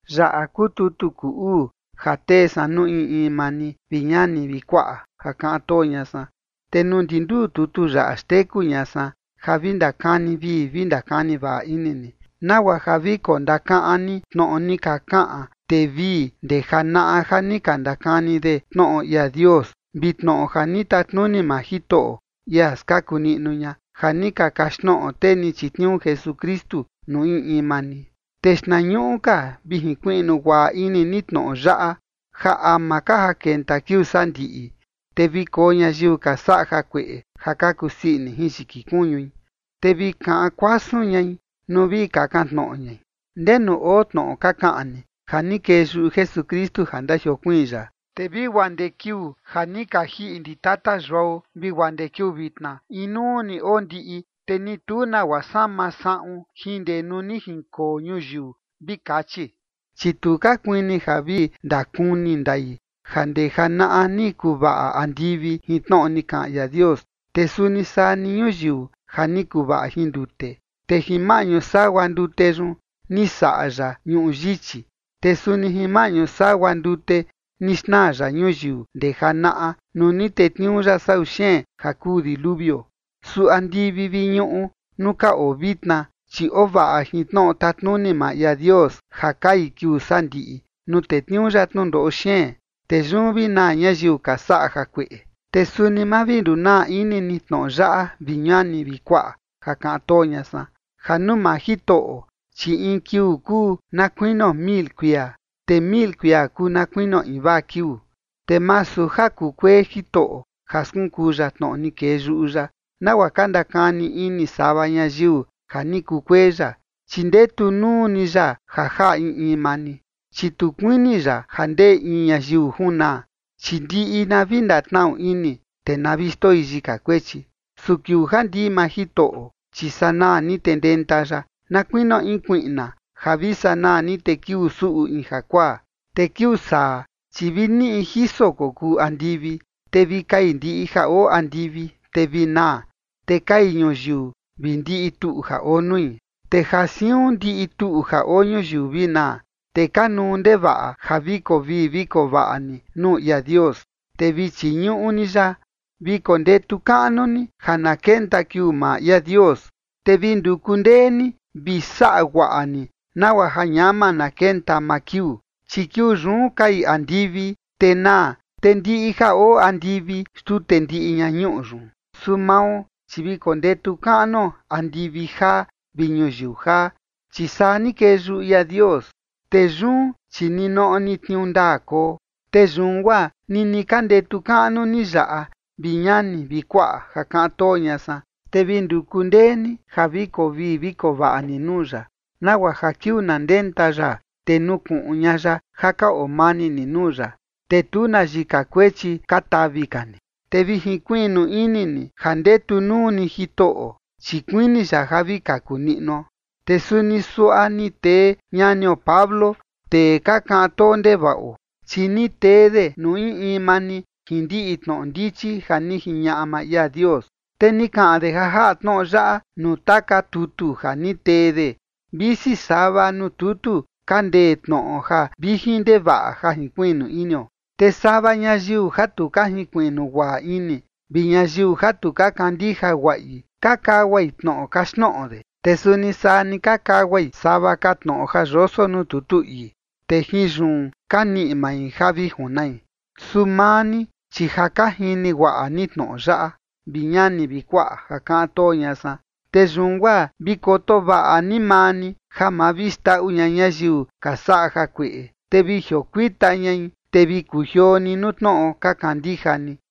Yaꞌa kuu tutu kuu uu ja tee san nuu in in maa ni, vi ñani vi kuaꞌa ja kaꞌan too ña san. Te nuu ndi nduu tutu yaꞌa xteku ña san ja vi ndakani vii vi ndakani vaꞌa ini ni, nagua ja vi kondakaꞌan ni tnoꞌo ni ka kaꞌan tee vii ndee janaꞌa ja ni ka ndakani de tnoꞌo ia Dios, vi tnoꞌo ja ni tatnuni maa Jitoꞌo, ia skaku niꞌnu ña, ja ni ka kaxtnoꞌo tee ni chitniuu Jesukristu nuu in in maa ni. Te xtnañuꞌu ka vi jinkuiꞌnu guaꞌa ini ni tnoꞌo yaꞌa, ja ama ka ja kenta kiuu sandiꞌi, te vi koo ñayiu ka saꞌa jakueꞌe ja ka kusii ini jin yiki kuñui, te vi kaꞌan kuasun ñai nuu vi kakan tnoꞌo ñai: “¿Ndenu oo tnoꞌo ka kaꞌan ni ja ni kee yuꞌu Jesukristu ja ndajiokuiin ya? Te vi guaa ndee kiuu ja ni ka jiꞌi ndi tata yuao vi guaa ndee kiuu vitna, inuu ni oo ndiꞌi, te ni tu nagua sama saꞌun jin ndee nuu ni jinkoo ñuyiu”, vi kachi. Chi tu ka kuini ja vi ndakuni ndai, ja ndee janaꞌa ni kuvaꞌa andivi jin tnoꞌo ni kaꞌan ia Dios, te suni saa ni ñuyiu ja ni kuvaꞌa jin ndute, te jin maꞌñu sagua ndute yun ni saꞌa ya ñuꞌu yichi. Te suni jin maꞌñu sagua ndute ni xnaa ya ñuyiu ndee janaꞌa nuu ni tetniuu ya sau xeen ja kuu diluvio. Su andivi vi ñuꞌu nuu ka oo vitna, chi oo vaꞌa jin tnoꞌo tatnuni maa ia Dios ja kai kiuu sandiꞌi, nuu tetniuu ya tnundoꞌo xeen, te yun vi naa ñayiu ka saꞌa jakueꞌe. Te suni ma vi ndunaa ini ni tnoꞌo yaꞌa, vi ñani vi kuaꞌa ja kaꞌan too ña san, ja nuu maa Jitoꞌo, chi in kiuu kuu na kuinio mil kuia, te mil kuia kuu na kuinio invaa kiuu. Te masu ja kukuee Jitoꞌo ja skunkuu ya tnoꞌo ni kee yuꞌu ya, nagua ka ndakani ini sava ñayiu ja ni kukuee ya, chi ndetu nuu ni ya ja jaꞌa in in maa ni, chi tu kuini ya ja ndee in ñayiu junaa, chi ndiꞌi na vi ndatnaꞌu ini, te na vi xndoi yika kuechi. Su kiuu ja ndii maa Jitoꞌo, chi sanaa ni te ndenta ya na kuinio in kuiꞌna, ja vi sanaa ni te kiuu suꞌu in jakuaa. Te kiuu saa, chi vi niꞌi jiso kokuu andivi, te vi kai ndiꞌi ja oo andivi, te vi naa, te kai ñuyiu vi ndiꞌi tuꞌu ja oo nui. Te ja siun ndiꞌi tuꞌu ja oo ñuyiu vi naa, te kanuu ndevaꞌa ja vi koo vii vi koo vaꞌa ni nuu ia Dios, te vi chiñuꞌu ni ya. Vi kondetu kaꞌnu ni ja na kenta kiuu maa ia Dios, te vi nduku ndee ni vi saꞌa guaꞌa ni nagua ja ñama na kenta maa kiuu. Chi kiuu yun kai andivi, te naa, te ndiꞌi ja oo andivi xtute ndiꞌi ña ñuꞌu yun. Su mao, chi vi kondetu kaꞌnuo andivi jaa vi ñuyiu jaa, chi saa ni kee yuꞌu ia Dios, te yun chi ninoꞌo ni tniuu ndaa koo. Te yun guaa nini ka ndetu kaꞌnu ni yaꞌa, vi ñani vi kuaꞌa ja kaꞌan too ña san, te vi nduku ndee ni ja koo vii vi koo vaꞌa ni nuu ya, nagua ja kiuu na ndenta ya, te nukuꞌun ña ya ja ka oo mani ni nuu ya, te tu na yika kuechi ka tavi ka ni. Te vi jinkuiꞌnu ini ni ja ndetu nuu ni Jitoꞌo, chi kuini ya ja vi kaku niꞌnuo. Te suni suaꞌa ni tee ñanio Pablo, tee ka kaꞌan too ndevaꞌo, chi ni tee de nuu in in maa ni jin ndiꞌi tnoꞌo ndichi ja ni jiñaꞌa maa ia Dios. Te ni kaꞌan de ja jaꞌa tnoꞌo yaꞌa nuu taka tutu ja ni tee de, visi sava nuu tutu ka ndee tnoꞌo ja vijin ndevaꞌa ja jinkuiꞌnu inio. Te sava ñayiu ja tu ka junkuiꞌnu guaꞌa ini vi ñayiu ja tu ka kandija guaꞌi ka kaguai tnoꞌo kaxtnoꞌo de, te suni saa ni ka kaguai sava ka tnoꞌo ja yoso nuu tutu ii, te jin yun ka niꞌi mai ja vi junai. Su maa ni, chi ja ka jini guaꞌa ni tnoꞌo yaꞌa, vi ñani vi kuaꞌa ja kaꞌan too ña san, te yun guaa vi koto vaꞌa ni maa ni ja ma vi xndaꞌu ña ñayiu ka saꞌa jakueꞌe, te vi jiokuita ñai, te vi kujioo ni nuu tnoꞌo ka kandija ni.